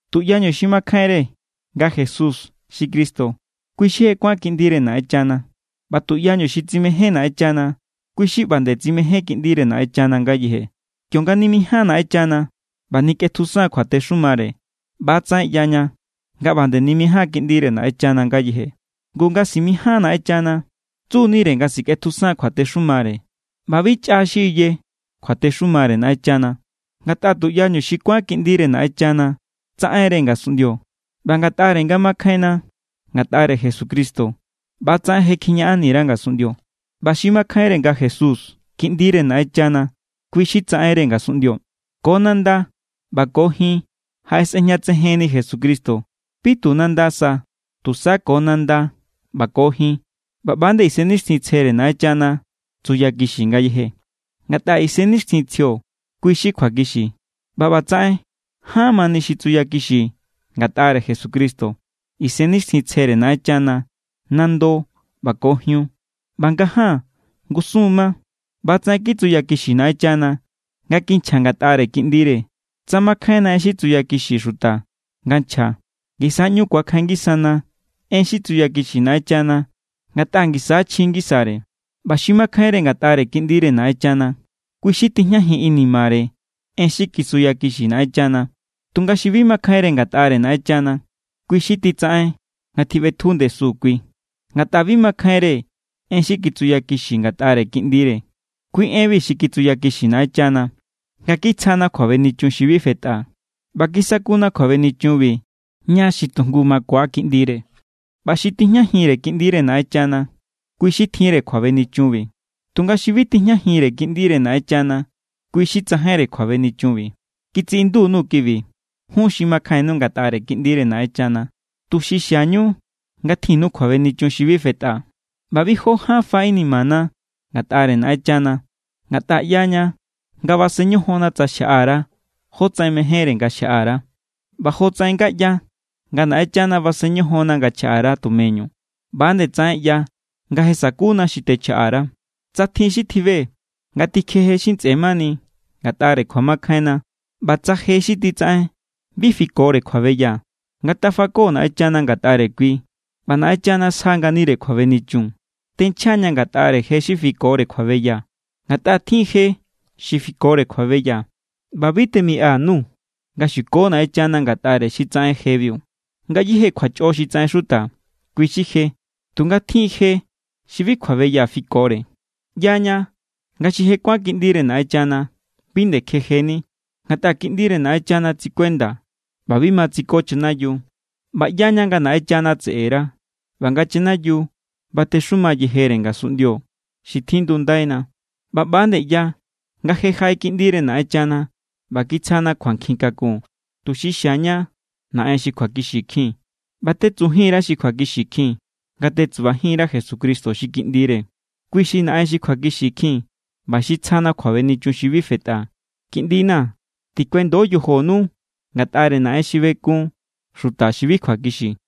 Tuꞌyañu xi makjainre nga Jesús xi Cristo, kui xi je kuán kiꞌndire Naꞌenchana. ꞌBa tuꞌyañu xi tsimején Naꞌenchana, kui xi ꞌba nde tsimején kiꞌndire Naꞌenchana ngayeje. Kionga nimijáan Naꞌenchana ꞌba nikꞌetjusan kjuatexumare, ꞌba=tsaꞌen ꞌyaña nga ꞌba nde nimijáan kiꞌndire Naꞌenchana ngayeje. Ngu, nga simijáan Naꞌenchana, tsu=nire nga sikꞌetjusan kjuatexumare. ꞌBa bi chꞌa xi iye kjuatexumare Naꞌenchana, ngatꞌa tuꞌyañu xi kuán kiꞌndire Naꞌenchana tsaꞌen=re ngasunꞌndio. ꞌBa ngatꞌare nga makjainna ngatꞌare Jesucristo, ꞌba=tsaꞌen je kjiñaꞌanni_ra ngasunꞌndio. ꞌBa xi makjainre nga Jesús Kiꞌndire Naꞌenchana, kui xi tsaꞌenre ngasunꞌndio. Ko nanda ꞌba ko jin jaꞌesꞌejñatsejenni Jesucristo. Bi tu nanda sa, tusa ko nanda ꞌba ko jin. ꞌBa ꞌba=nde Isennixtjintsjere Naꞌenchana tsuyakixi ngayeje, ngatꞌa Isennixtjintsjio kui= xi kjuakixi. ꞌBa ꞌbatsaꞌen ján= mani xi tsuyakixi ngatꞌare Jesucristo: Isennixtjintsjere Naꞌenchana, nando ꞌba ko jiun. ꞌBa ngaján ngusun= ma. ꞌBa=tsaꞌen kitsuyakixi Naꞌenchana nga kinchja ngatꞌare Kiꞌndire. Tsa makjainna en xi tsuyakixi xuta nga nchja, ngisa= ꞌñu ku̱akjain ngisana en xi tsuyakixi Naꞌenchana ngatꞌa ngisa= chji ngisare. ꞌBa xi makjainre ngatꞌare Kiꞌndire Naꞌenchana, kui xi tijñajin inimare en xi kitsuyakixi Naꞌenchana. Tunga xi bi makjainre ngatꞌare Naꞌenchana, kui xi titsaꞌen nga tjiꞌbetju ndesu kui, ngatꞌa bi makjainre en xi kitsuyakixi ngatꞌare Kiꞌndire. Kui enbi xi kitsuyakixi Naꞌenchana, nga kitsjana kjuabenichun xi bi fetꞌa. ꞌBa kisakuna kjuabenichunbi ña xi tu jngu makua Kiꞌndire. ꞌBa xi tijñajinre Kiꞌndire Naꞌenchana, kui xi tjinre kjuabenichunbi. Tunga xi bi tijñajinre Kiꞌndire Naꞌenchana, kui xi tsajainre kjuabenichunbi. Kitsiꞌindu_nuu̱ kibi jun xi makjainnu ngatꞌare Kiꞌndire Naꞌenchana, tuxi xiañu nga tjinnu kjuabenichun xi bi fetꞌa. ꞌBa bi jó ján fa inimana ngatꞌare Naꞌenchana, ngatꞌa ꞌyaña nga basen ñojonna tsa xjaꞌa_ra jotsaꞌen mejénre nga xjaꞌa_ra. ꞌBa jotsaꞌen nga ꞌya nga Naꞌenchana basen ñojonna nga chjaꞌa_ra tumeñu, ꞌba=nde tsaꞌen ꞌya nga je sakuna xi techjaꞌa_ra. Tsa tjin xi tjibe nga tikjeje xi ntsꞌe mani ngatꞌare kjuamakjainna, ꞌba tsa je xi titsaꞌen bi fikore kjuabeya, ngatafako Naꞌenchana ngatꞌare kui ꞌba Naꞌenchana sja=nganire kjuabenichun. Tenchja=ña̱ ngatꞌare je xi bi fikore kjuabeya, ngatꞌa tjin= je xi fikore kjuabeya, ꞌba bi temiꞌa_nuu̱ nga xuko Naꞌenchana ngatꞌare xi tsaꞌen jebiu. Ngayéje kjuachꞌo xi tsaꞌen xuta, kui xi je. Tunga tjin= je xi bi kjuabeya fikore. ꞌYaña nga xi je kuán kiꞌndire Naꞌenchana bi nde kjejeni, ngatꞌa Kiꞌndire Naꞌenchana tsikuenda ꞌba bi ma tsiko chanayiu. ꞌBa ꞌyaña nga Naꞌenchana tseꞌera ꞌba nga chanayiu batexuma yejere ngasunꞌndio xi tjindundaina. ꞌBa ꞌba=nde ꞌya nga je jaꞌe Kiꞌndire Naꞌenchana ꞌba kitsjana kjuankjin kakun, tuxi xiaña Naꞌen xi kjuakixikjin. ꞌBa tetsubajin_ra xi kjuakixikjin, nga tetsubajin_ra Jesucristo xi Kiꞌndire. Kui xi Naꞌen xi kjuakixikjin ꞌba xi tsjana kjuabenichun xi bi fetꞌa. Kiꞌndina̱, tikuendo yojonu ngatꞌare naꞌen xi bekun xuta xi bi kjuakixi.